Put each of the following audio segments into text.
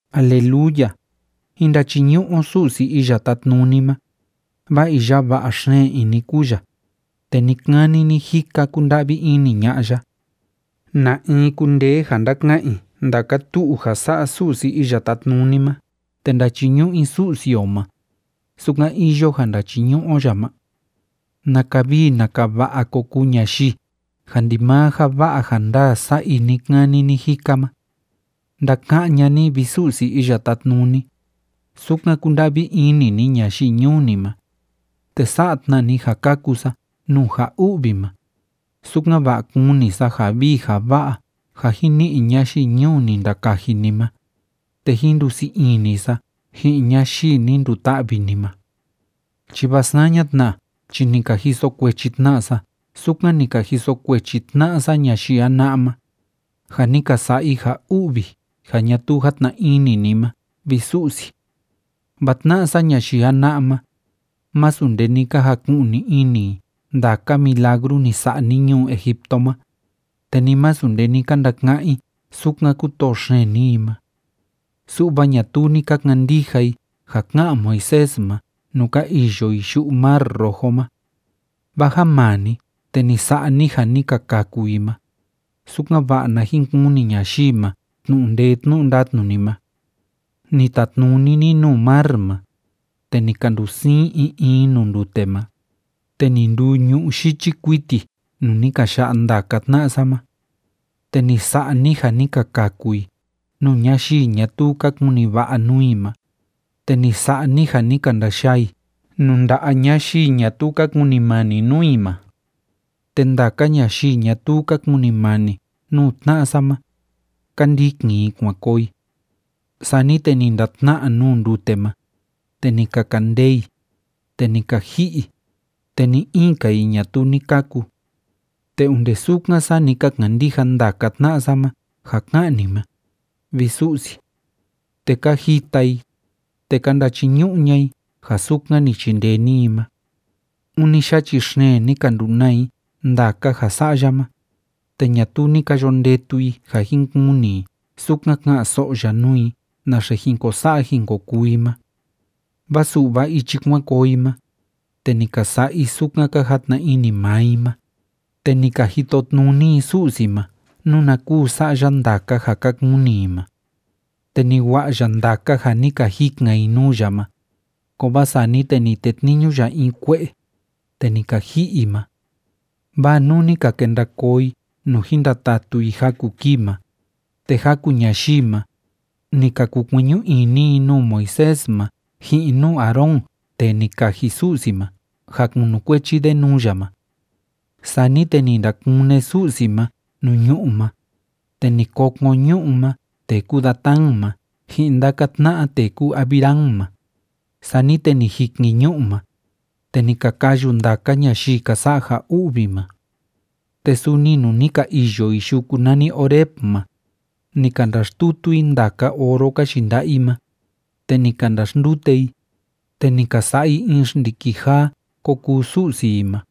Aleluya. Jín ndachiñu'u o Su'si Iya Tátnuni ma, vaa iya va'a xeen ini kúu ya, te ni‑kani ni‑jika kúnda'vi ini ña'a ya. ¿Na in kundee ja ndaka'an i ndaka tu'u ja sa'a Su'si Iya Tátnuni ma te ndachiñu'u i Su'si o ma, sukan iyo ja ndachiñu'u o ya ma? ¡Naka vii naka va'a ko kuu ñayii ja ndimaa ja va'a ja ndaa sa'a i ni‑kani ni‑jika ma! Ndaka'án ña'a ni, vi Su'si Iya Tátnuni, sukan kúnda'vi ini ni ñayii ñuu ni ma, te sa'a tna ni ja kaku sa nuu ja u'vi ma, sukan‑va'a kuni sa ja vii ja va'a ja jin ni'i ñayii ñuu ni ndakaji ni ma, te jín ndusii ini sa ji'in ñayii ni nduta'vi ni ma. Chi vaa saña tna chi ni ka jiso kuechi tna sa sukan ni ka jiso kuechi tna'a sa ñayii jana'a ma, ja ni ka sa'a i ja u'vi ja ñatuu játna ini ni ma, vi Su'si. Vaa tna'a sa ñayii jana'a ma, másu nde ni ka jaku'ni ini i ndaka milagru ni sa'a ni ñuu Egipto ma, te ni masu nde ni ka ndaka'án i sukan kútoo xeen ni i ma. Su'va ñatuu ni ka kandija i ja ká'an Moisés ma nuu ka iyo i yu'u Mar Rojo ma. Vaa ja maa ni, te ni sa'a ni ja ni ka kaku i ma, sukan‑va'a na jin kuni ñayii ma tnu'u ndee tnu'u ndatnu ni ma. Ni tatnuni ni nuu mar ma, te ni ka ndusiin in in nuu ndute ma, te ni nduu ñu'ú yichi kuiti nuu ni ka ya'a ndaka tna'a sa ma. Te ni sa'a ni ja ni ka kaku i nuu ñayii ñatuu ka kuni va'a nuu i ma, te ni sa'a ni ja ni ka ndayaa i nuu nda'a ñayii ñatuu ka kunimani nuu i ma. Te ndaka ñayii ñatuu ka kunimani nuu tna'a sa ma, ka ndikin i kuan koo i. Sani te ni ndatna'a nuu ndute ma, te ni ka kandee i, te ni ka ji'i i, te ni‑in‑ka i ñatuu ni kaku. Te onde sukan, saa ni ka kandija ndaka tna'a sa ma ja ká'an ni ma, vi Su'si. Te ka jita i, te ka ndachiñu'u ña'a i ja sukan ni chindee ni i ma. Ûni yachi xeen ni ka ndunaa i ndaka ja sa'a ya ma, te ñatuu ni ka yo ndetu i ja jin kuni i sukan ka'an‑so'o ya nuu i naxe jin ko sa'a jin ko kuu i ma. Vaa su'va ichi kuan koo i ma, te ni ka sa'a i sukan ka jatna ini maa i ma, te ni ka jitotnuni i Su'si ma nuna kúu sa'a ya ndaka ja ka kuni i ma. Te ni wa'a ya ndaka ja ni ka jikan i nuu ya ma, kovaa sani te ni tetniñu ya in kue'e, te ni ka ji'i i ma. Vaa nuu ni ka kenda koo i nuu jin ndatatu i jaku kii ma, te jaku ñayii ma, ni ka kukueñu ini i nuu Moisés ma ji'in nuu Aarón tee ni kaji Su'si ma ja kunukuechi de nuu ya ma. Sani te ni ndakune Su'si ma nuu ñu'ú ma, te ni kokon ñu'ú ma tee kúu Datán ma ji'in ndaka tna'a tee kúu Abiram ma, sani te ni jikin ñu'u ma, te ni ka kayu ndaka ñayii ka sa'a ja u'vi ma. Te suni nuu ni ka iyo i yuku nani Horeb ma, ni ka ndaxtutu i ndaka oro ka yinda'a i ma, te ni ka ndaxndute i, te ni ka sa'a i in xndiki jaa ko kuu su'si i ma,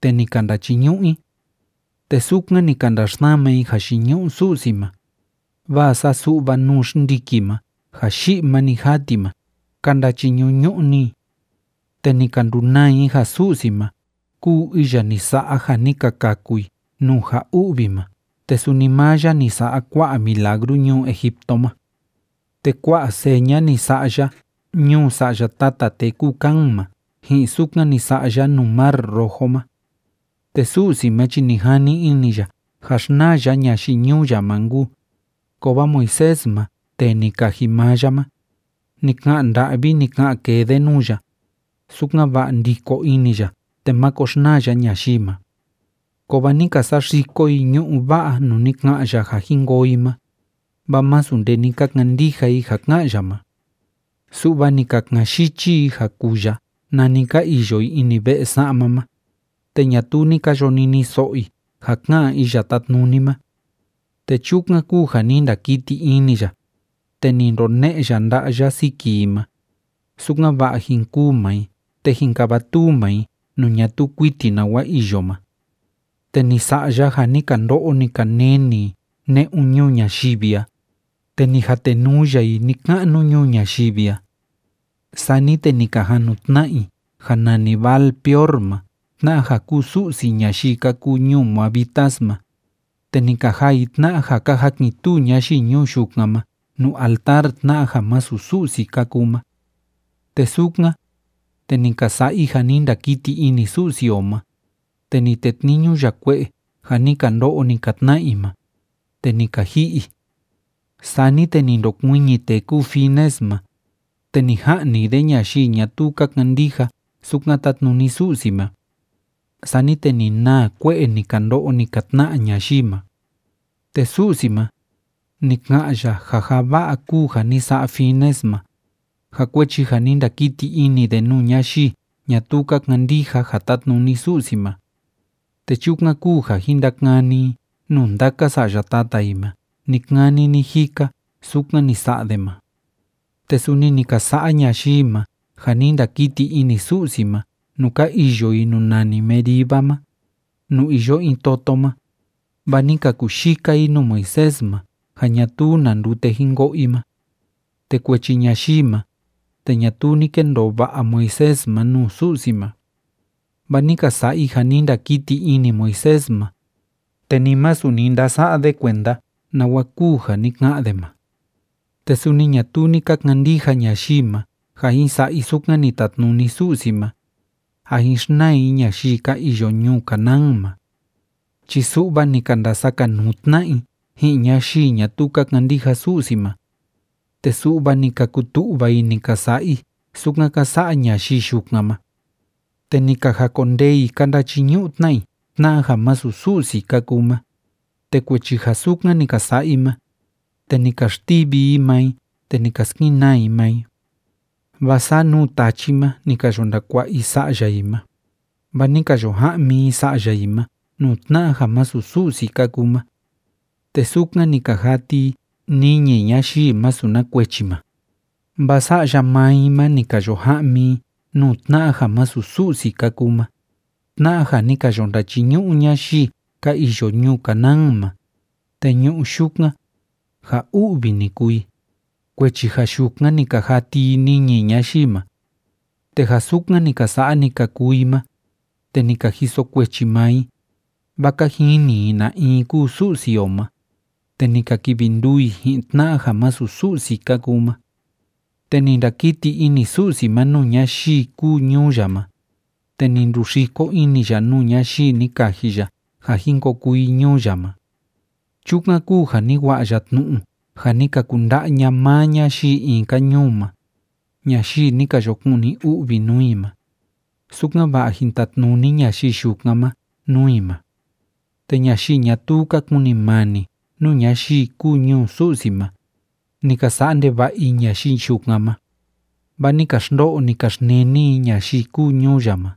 te ni ka ndachiñu'u i. Te sukan ni ka ndaxsama i jayiñu'u Su'si ma, vaa saa su'va nuu xndiki ma ja yi'i ma‑ni jaa ti ma ka ndachiñu'u‑ñu'u‑ni i. Te ni ka ndunaa i ja Su'si ma kúu iya ni sa'a ja ni ka kaku i nuu ja u'vi ma te suni maa ya ni sa'a kua'a milagru ñuu Egipto ma. Te kua'a seña ni sa'a ya ñuu sa'ya tata tee kúu Cam ma ji'in sukan ni sa'a ya nuu Mar Rojo ma. Te Su'si ma chi ni jani ini ya ja xnaa ya ñayii ñuu ya ma nkuu, kovaa Moisés ma tee ni kaji maa ya ma, ni ka'an nda'vi, ni ka'an kee de nuu ya, sukan‑va'a ndiko ini ya te máko xnaa ya ñayii ma. Kovaa ni ka saxiko i ñu'ú va'a nuu ni ka'an ya ja jin koo i ma, vaa másu nde ni ka kandija i ja ká'an ya ma. Su'va ni ka ka'an yichi i ja kuu ya nani ka iyo i ini ve'e sa'ma ma, te ñatuu ni ka yo niniso'o i ja ká'an Iya Tátnuni ma. Te chukan kúu ja ni ndakiti ini ya, te ni ndone'e ya nda'a ya siki i ma, sukan‑va'a jin kûu maa i te jin kavatuu maa i nuu ñatuu kuiti nawa iyo ma. Te ni sa'a ya ja ni ka ndo'o, ni ka neni i ne'un ñuu ñayivi a, te ni jatenuu ya i ni‑ka'nu ñuu ñayivi a. Sani te ni ka jan nu tna'a i ja nani Baal‑peor ma tna'a ja kúu su'si ñayii ka kuu ñuu moabitas ma, te ni ka jaa i tna'a ja ka jakin‑tuu ñayii ñuu yukan ma nuu altar tna'a ja masu Su'si ka kuu ma. Te sukan, te ni ka sa'a i ja ni ndakiti ini Su'si o ma, te ni tetniñu ya kue'e ja ni ka ndo'o, ni ka tna'a i ma, te ni ka ji'i i. Sani te ni ndokuiñi tee kúu Finees ma, te ni ja'ni de ñayii ñatuu ka kandija sukan tátnuni Su'si ma. Sani te ni naa kue'e ni ka ndo'o, ni ka tna'a ñayii ma. Te Su'si ma, ni ka'an ya ja ja va'a kúu ja ni sa'a Finees ma, ja kuechi ja ni ndakiti ini de nuu ñayii ñatuu ka kandija ja tátnuni Su'si ma. Te chukan kúu ja jin ndakani i nuu ndaka sa'ya tata i ma ni‑kani ni‑jika sukan ni sa'a de ma. Te suni ni ka sa'a ñayii ma ja ni ndakiti ini Su'si ma nuu ka iyo i nuu nani Meriba ma, nuu iyo in toto ma, vaa ni ka kuyika i nuu Moisés ma ja ñatuu na ndute jin ko'o i ma. Te kuechi ñayii ma, te ñatuu ni kendoo va'a Moisés ma nuu Su'si ma. Vaa ni ka sa'a i ja ni ndakiti ini Moisés ma, te ni masu ni ndasa'a de kuenda nawa kúu ja ni ka'an de ma. Te suni ñatuu ni ka kandija ñayii ma ja jin sa'a i sukan ni tatnuni Su'si ma, ja jin xnaa i ñayii ka iyo ñuu Canaán ma. Chi su'va ni ka ndasakanuu tna'a i ji'in ñayii ñatuu ka kandija Su'si ma, te su'va ni ka kutu'va i ni ka sa'a i sukan ka sa'a ñayii yukan ma. Te ni ka jakondee i ka ndachiñu'u tna i tna'a ja masu Su'si ka kuu ma, te kuechi ja sukan ni ka sa'a i ma, te ni ka xtivi i maa i te ni ka skenaa i maa i. Vaa saa nuu tachi ma ni ka yo ndakua'a i sa'ya i ma, vaa ni ka yo ja'mi i sa'ya i ma nuu tna'a ja masu Su'si ka kuu ma. Te sukan ni ka jati i niñi ñayii masu na kuechi ma, vaa sa'ya maa i ma ni ka yo ja'mi i nuu tna'a ja masu Su'si ka kuu ma, tna'a ja ni ka yo ndachiñu'u ñayii ka iyo ñuu Canaán ma, te ñu'u yukan, ja u'vi ni kuu i, kuechi ja yukan ni ka jati i niñi ñayii ma. Te ja sukan ni ka sa'a, ni ka kuu i ma, te ni ka jiso kuechi maa i, vaa ka jini i na in kúu Su'si o ma, te ni ka kivi nduu i ji'in tna'a ja masu Su'si ka kuu ma. Te ni ndakiti ini Su'si ma nuu ñayii kúu ñuu ya ma, te ni nduxiko ini ya nuu ñayii ni kaji ya ja jin ko kuu i ñuu ya ma. Chukan kúu ja ni wa'a ya tnu'u ja ni ka kunda'a ña'a maa ñayii in‑ka ñuu ma ñayii ni ka yo kuni u'vi nuu i ma, sukan‑va'a jín tatnuni ñayii yukan ma nuu i ma. Te ñayii ñatuu ka kunimani nuu ñayii kúu ñuu Su'si ma, ni ka sa'a ndeva'a i ñayii yukan ma, vaa ni ka xndo'o, ni ka xneni i ñayii kúu ñuu ya ma.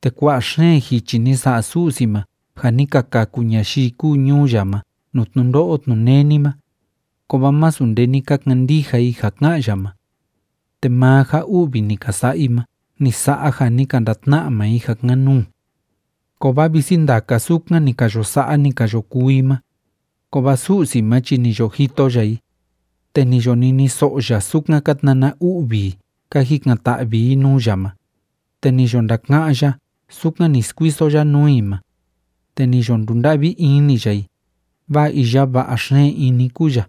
Te kua'a xeen jichi ni sa'a Su'si ma ja ni ka kaku ñayii kúu ñuu ya ma nuu tnundo'o tnuneni ma, kovaa masu nde ni ka kandija i ja ká'an ya ma. Te maa ja u'vi ni ka sa'a i ma ni sa'a ja ni ka ndatna'a maa i ja kan‑nuu. Kovaa visi ndaka sukan ni ka yo sa'a, ni ka yo kuu i ma, kovaa Su'si ma chi ni yo jito ya i, te ni yo niniso'o ya sukan ka tnana u'vi i ka jikan‑ta'vi i nuu ya ma. Te ni yo ndaka'án ya sukan ni skuiso ya nuu i ma, te ni yo ndunda'vi ini ya i, vaa iya va'a xeen ini kúu ya.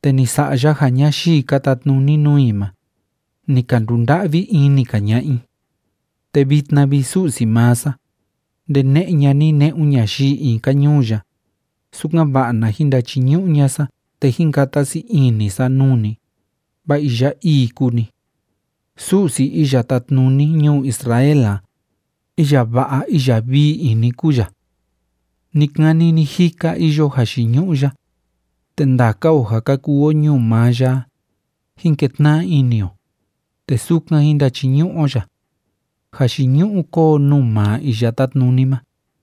Te ni sa'a ya ja ñayii ka tatnuni nuu i ma, ni ka ndunda'vi ini‑ka ña'a i. Te vitna vi, Su'si maa sa, ndene'e ña'a ni ne'un ñayii in‑ka ñuu ya, sukan‑va'a na jin ndachiñu'u ña'a sa te jín kata sii ini sa nuu ni, vaa iya ii kúu ni. Su'si iya tátnuni ñuu Israel a, iya va'a iya vii ini kúu ya. Ni‑kani ni‑jika iyo jayiñu'u ya, te ndaka o ja ka kuu o ñuu maa ya a, jín ketna'a ini o, te sukan jín ndachiñu'u o ya. ¡Jayiñu'u kóo nuu maa Iya Tátnuni ma!